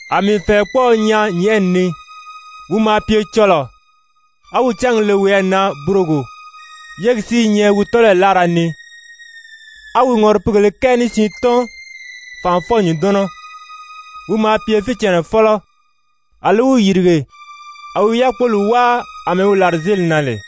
A mii fɛ̀ɛkpɔɔɔ nyaa nyɛ̀ʔɛni ni, wi maa pye cɔlɔɔ, a wi cángi le wiyɛɛ na burogo, yégi si i nyɛ wi tɔ́lɔyi láara ni, á wi ŋɔripiigèlē kɛɛ ní siin tɔ́n fànʔafɔ-nyùndɔnnɔ. Wi maa pye fícɛnnɛfɔlɔ, á li wi yìrige, a wi i yákpoli wáa àmɛɛ wi làrizeeli nan lè.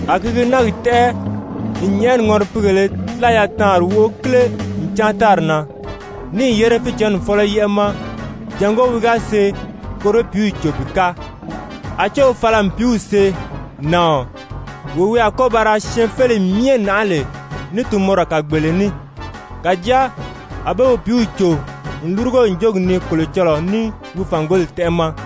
A ki gi nángi tɛ́ʔɛ n nyɛ̀ʔɛni ŋɔripiigèlē tílaya taanri wóʔo kíle n cáan tári na, níì yére fícɛnni fɔ́lɔ yɛ́ʔɛ ma jàngó wi ga see, koro í pìíw cò bi káa. A céw fala n pìíw see, nàɔn, wee wi a kɔ́ ba ra syɛɛnfeleyi myɛ nàʔá lè ní tunmɔrɔ kàgbeele ní. Kàjáa a be wi pìíw cò n lúrugo ǹjogi ni Kolocɔlɔɔ ní wi fàngoli tɛ́ʔɛ ma.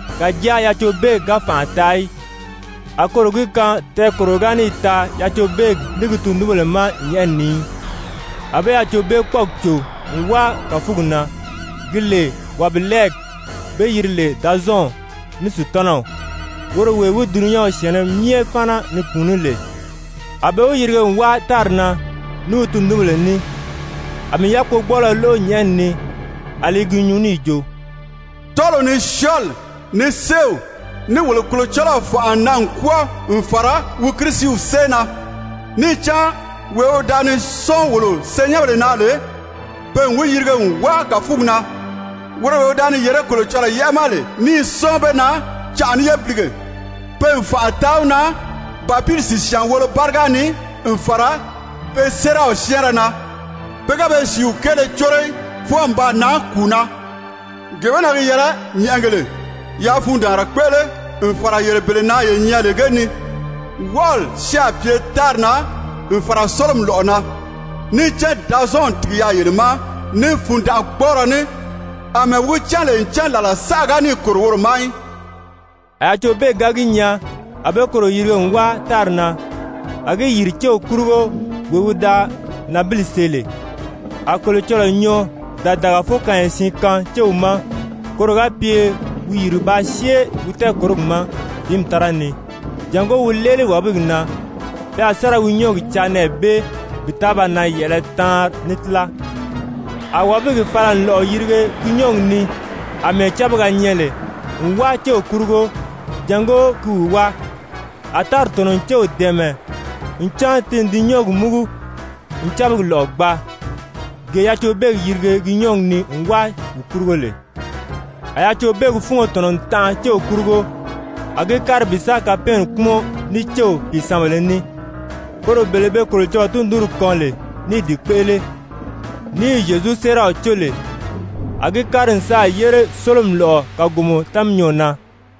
kàjáa yacobeegi ga fànʔa taa í, a koro gi kaan tɛɛkòrogo ga níì taa yacobeegi ní gi tundunbèle ma nyɛ̀ʔɛni ni í. A be yacobeekpɔɔgi cò n wáa kàfugi na, gi lè wàbilɛɛgi, be yiri lè Dàzɔɔnw, ní Sutanaw, woro wee wi dulunyanw syɛ̀ɛnnɛ myɛ fáana ni pùuní lè. A be wi yirige n wáa tári na ní wi tundunbèle ní. A mii yákpogbɔɔlɔ lóʔo nyɛ̀ʔɛni ni, a li i gi nyuu níì jo: «Tɔ́ɔliw ni syɔɔli, ní séew, ní wolo Kolocɔlɔw fànʔa n nan n kwɔ́ɔ n fàra wi Kirisiw sée na. Níì cán wee wi da ni sɔ́ɔn wolo senyɛnbèle na lè, pe n wi yirige n wáa kàfugi na, woro wee wi da ni yèré Kolocɔlɔɔ yɛ́ʔɛ ma lè ní i sɔ́ɔn be na canʔa ní yébilige. Pe n fànʔa taa wi na Bàpili sìsyaan wolo báriga ni n fàra be séeraw syɛ́ɛnrɛ na, pe ga be sìíw kéele córo í, fwɔɔ n baa nan kùu na. Gee bee na gi yɛlɛ, nyɛ̀ʔɛgèle, yaa fundaanra kpéʔele n fàra yele bele na ye nyɛ lè ge ni! Wɔʔɔli si a pye tári na n fàra sólomi lɔ̀ʔɔ na! Níì cán Dazɔɔnw n tìgi yaà yele ma ní fundanʔagbɔɔrɔ ní àmɛɛ wi gi cán lè ncan làla saʔa ga níì kòro woro ma í.» A yacobeegi ga gi nyaa a be koro yirige n wáa tári na, a gi yìri céw kurugo wee wi da nànbili see lè. A Kolocɔlɔɔ nyɔɔ̀ dàdaga fókaanya siin kaan céw ma koro ga pye wi yìri bàā syée wi tɛɛkòrogi ma fìími tára ni, jàngó wi léeli wàbigi na, pe a sa ra wi nyɔ́ɔgi caa nɛɛ bee bi ba taa yɛ̀ʔɛlɛ taanri ní tíla. A wàbigi fala n lɔ̀ʔɔ yirige ki nyɔ́ɔgi ni àmɛɛ cábiga nyɛ lè n wáa céw kurugo, jàngó ki wi wáa. A tári tɔ̀nɔ n céw dɛ̀ɛmɛ ncan ti n di nyɔ́ɔgi múgu n cábigi lɔ́ʔɔ gbaa, gee yacobeegi yirige gi nyɔ́ɔgi ni n wáa wi kurugo lè. A yacobeegi fúngo tɔ̀nɔ n tanʔa céw kurugo, a gi kári bi sa kapɛɛnni kpúmɔn ní céw pìisanbèlē ní, poro bele be Kolocɔlɔɔ tundunri kɔn lè ní i di kpéʔele, ní i Zyezu séeraw có lè. A gi kári n sáà yére sólomi lɔ̀ʔɔ kagomɔ táminyɔɔ na.